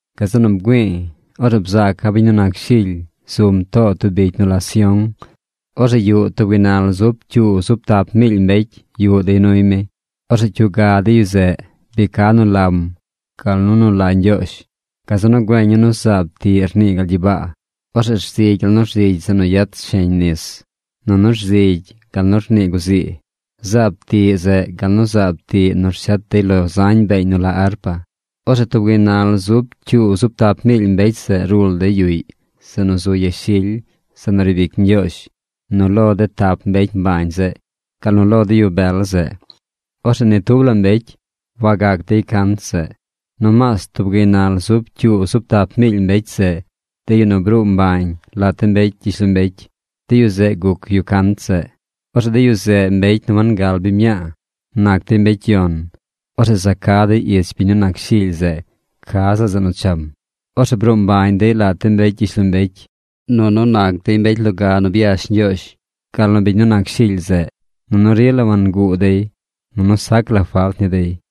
Gazeꞌ nu bgüi̱i̱. Orzeꞌ bzaaca̱ biñ nu nac Shily zum too tub bicy nu la Sión. Orzeꞌ yuꞌ tub gaynal zub cyuu zub tap miily mbecy yuꞌ dey nuy mi. Orzeꞌ cyuga de yu zeꞌ bi ca nu lam gal nu nu la Ñgyoozh. Gazeꞌ nu güeña̱ nu zaab tiꞌ rnii gal gyibaa. Orzeꞌ rzigy gal nu rzigy zeꞌ nu yet sheñ nis. Nunu rzigy gal nu rnii guzii. Zaab tiꞌ zeꞌ gal nu zaab tiꞌ nu rshet dey lo zañ beeñ nu la arpa. Orzeꞌ tub gaynal zub cyuu zub tap miily mbecy zeꞌ rul dey yuꞌy zeꞌ nu zu yashily zeꞌ nu riib ic Ñgyoozh, nu lo de tap mbecy mbañ zeꞌ, gal nu lo de yu bel zeꞌ. Orzeꞌ ni tub la mbecy wagac dey cant zeꞌ. Nomaas tub gaynal zub cyuu zub tap miily mbecy zeꞌ, de yu nu bruu mbañ lat de mbecy gyishlombecy, de yu zeꞌ guc yu cant zeꞌ. Orzeꞌ de yu zeꞌ mbecy nu wangal biñ mñaa. Nac dey mbecy yon. Orzeꞌ za ca dey ich biñ nu nac Shily zeꞌ ca ziꞌl zeꞌ nu cham. Orzeꞌ bruu mbañ dey lat de mbecy gyishlombecy, nunu nac dey mbecy loga nu byash Ñgyoozh, gal nu biñ nu nac Shily zeꞌ. Nunu rila wanguu dey. Nunu sac la falt ni dey.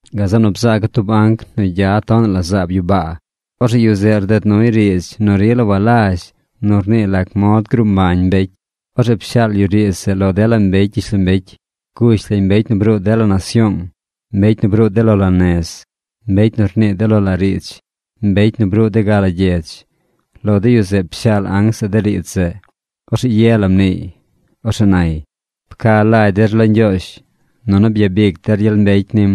Gazeꞌ nu bzaaca̱ tub anc nu gya tonaꞌ la zaab yu baa. Orzeꞌ yu zeꞌ rded nuy riidz nu rila walazh nu rnii lac mod gruu mbañ mbecy. Orzeꞌ pshaal yu riidz zeꞌ lo dela mbecy gyishlombecy. Gush lañ mbecy nu bruu dela nasyoong, mbecy nu bruu de lo la nez, mbecy nu rnii de lo la riidz, mbecy nu bruu de ga la gyedz. Lo de yu zeꞌ pshaal anc zeꞌ de riidz zeꞌ. Orzeꞌ ye la mniiy. Orzeꞌ nay: ―Pca lagy der lo Ñgyoozh nunu byabic der gyel mbecy nim.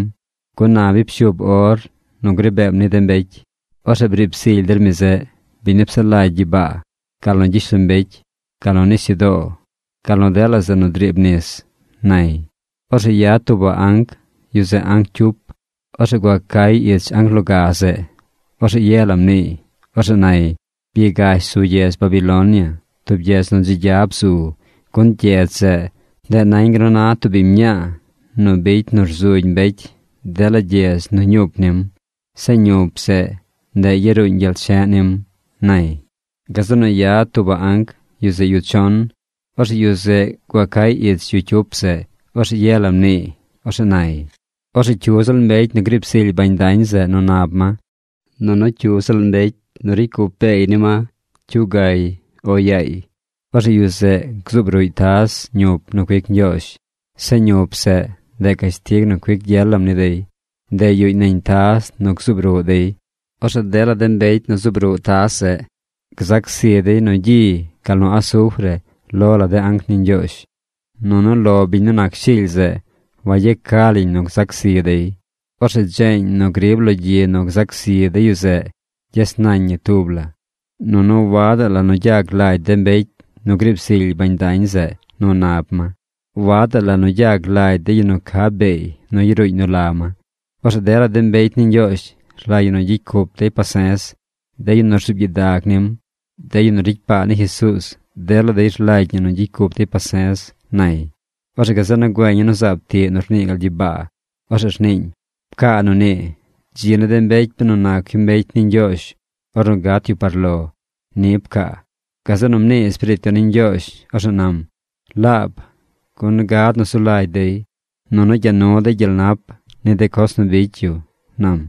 Gun na bi pshuub or nu gri beem ni de mbecy. Orzeꞌ briib zily der mi zeꞌ, biñ nu psaꞌ lagy gyibaa, gal nu gyishlombecy, gal nu nisyudoo, gal nu dela zeꞌ nu driib nis ―nay. Orzeꞌ yad tuubaꞌ anc. Yu zeꞌ anc cyup. Orzeꞌ gua cay ich anc loga zeꞌ. Orzeꞌ ye la mniiy. Orzeꞌ nay: ―Byagash zu gyedz Babilonia, tub gyedz nu dzi gya bzu, gun gyedz zeꞌ, ndeꞌ nañ gal nu na tub biñ mñaa nu bicy nu rzugy mbecy dela gyedz nu ñup nim. Zeꞌ ñup zeꞌ, ndeꞌ yaruuñ gyel che̱ꞌ nim ―nay. Gazeꞌ nu yad tuubaꞌ anc. Yu zeꞌ yu chon. Orzeꞌ yu zeꞌ gua cay ich yu cyup zeꞌ. Orzeꞌ ye la mniiy. Orzeꞌ nay: ―Orzeꞌ cyu ziꞌl mbecy nu griib zily bañ dañ zeꞌ nu nab ma, nunu cyu ziꞌl mbecy nu ricy cup beey ni ma cyugay o yaay, orzeꞌ yu zeꞌ gzuub ruꞌy taz ñup nu cuic Ñgyoozh. Zeꞌ ñup zeꞌ, ndeꞌ cashtig nu cuic gyel lam ni dey. Ndeꞌ yuꞌñ nañ taz nu gzuub ruꞌ dey. Orzeꞌ dela de mbecy nu zuub ruꞌ taz zeꞌ, gzac zi dey nu gyi gal nu asufre lo la de anc ni Ñgyoozh. Nunu lo biñ nu nac Shily zeꞌ wayeca lañ nu zac zi dey. Orzeꞌ dzeeñ nu grib lo gyi nu gzac zi de yu zeꞌ, gyes nañ ñi tub la. Nunu wadaꞌ nu gyag lagy de mbecy nu griib zily bañ dañ zeꞌ nu nab ma. Wadaꞌ nu gyag lagy de yu nu ca beey nu yaruuñ nu la ma. Orzeꞌ dela de mbecy ni Ñgyoozh rlagy ñi nu gyicy cup dey pase̱z. De yu nu rzuub gyidag nim, de yu nu ricy paa ni Jesuuz, dela dey rlagy ñi nu gyicy cup dey pase̱z ―nay. Orzeꞌ gazeꞌ nu güeña̱ nu zaab tiꞌ nu rnii gal gyibaa. Orzeꞌ rniiñ: ―Pcaa nu nii: “Dzi ni de mbecy benu nac yu mbecy ni Ñgyoozh ornu gat yu par lo.” Ni pcaa. Gazeꞌ nu mnii Espiriit Yon ni Ñgyoozh. Orzeꞌ nam: ―Laab, gun gad nu zu lagy dey, nunu gya nu dey gyel nap ni de coz nu bicy yu ―nam.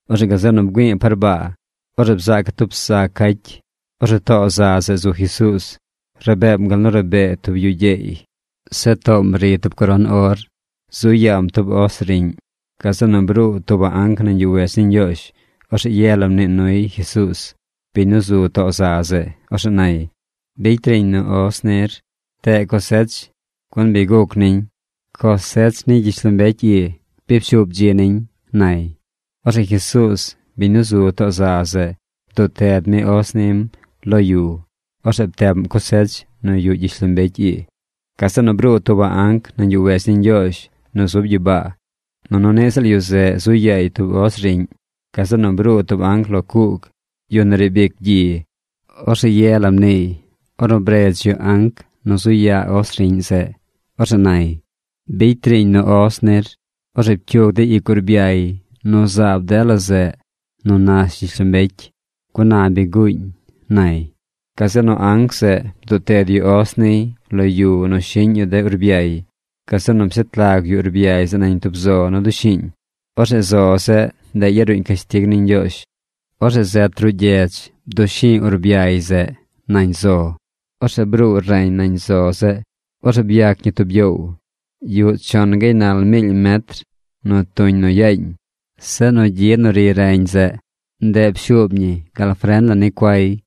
Orzeꞌ gazeꞌ nu bgüi̱i̱ par baa. Orzeꞌ bzaaca̱ tub za cacy. Orzeꞌ too za zeꞌ zu Jesuuz. Rabeem gal nu rabee tub yu gyeey. Zeꞌ toom ri tub coron or. Zu yaam tub os riꞌñ. Gazeꞌ nu bruu tuubaꞌ anc nañ yuꞌ wedz ni Ñgyoozh. Orzeꞌ ye la mnii nuy Jesuuz, biñ nu zu too za zeꞌ. Orzeꞌ nay: ―Bicy riiñ nu os nir. Pteꞌ cosech, gun bi guc niñ. Cosech ni gyishlombecy ii bi pshuub dzi niñ ―nay. Orzeꞌ Jesuuz, biñ nu zu too za zeꞌ bduꞌ ted mi os nim lo yu. Orzeꞌ pteꞌm cosech nu yuꞌ gyishlombecy ii. Gazeꞌ nu bruu tuubaꞌ anc nañ yuꞌ wedz ni Ñgyoozh nu zub gyibaa. Nunu niꞌ ziꞌl yu zeꞌ zu yaay tub os riꞌñ. Gazeꞌ nu bruu tub anc lo cuug, yu nu riib ic gyi. Orzeꞌ ye la mniiy ornu bredz yu anc nu zu yaa os riꞌñ zeꞌ. Orzeꞌ nay: ―Bicy riiñ nu os nir. Orzeꞌ pcyug de ic urbyay nu zaab dela zeꞌ nu nash gyishlombecy, gun na bi guuñ ―nay. Gazeꞌ nu anc zeꞌ bduꞌ ted yu os niy lo yu nu shiꞌñ yu de urbyay. Gazeꞌ nu pshet lag yu urbyay zeꞌ nañ tub zo nu dushi̱i̱ñ. Orzeꞌ zo zeꞌ, ndeꞌ yaruuñ cashtig ni Ñgyoozh. Orzeꞌ zet ruꞌ gyedz bdushi̱i̱ urbyay zeꞌ nañ zo zeꞌ. Orzeꞌ bruu reñ nañ zo zeꞌ. Orzeꞌ byac ñi tub gyoow. Yuꞌ chon gaynal miily metr nu tuñ nu yaañ. Zeꞌ nu gyi nu ri reñ zeꞌ, ndeꞌ pshuub ñi gal fren la ni cuay.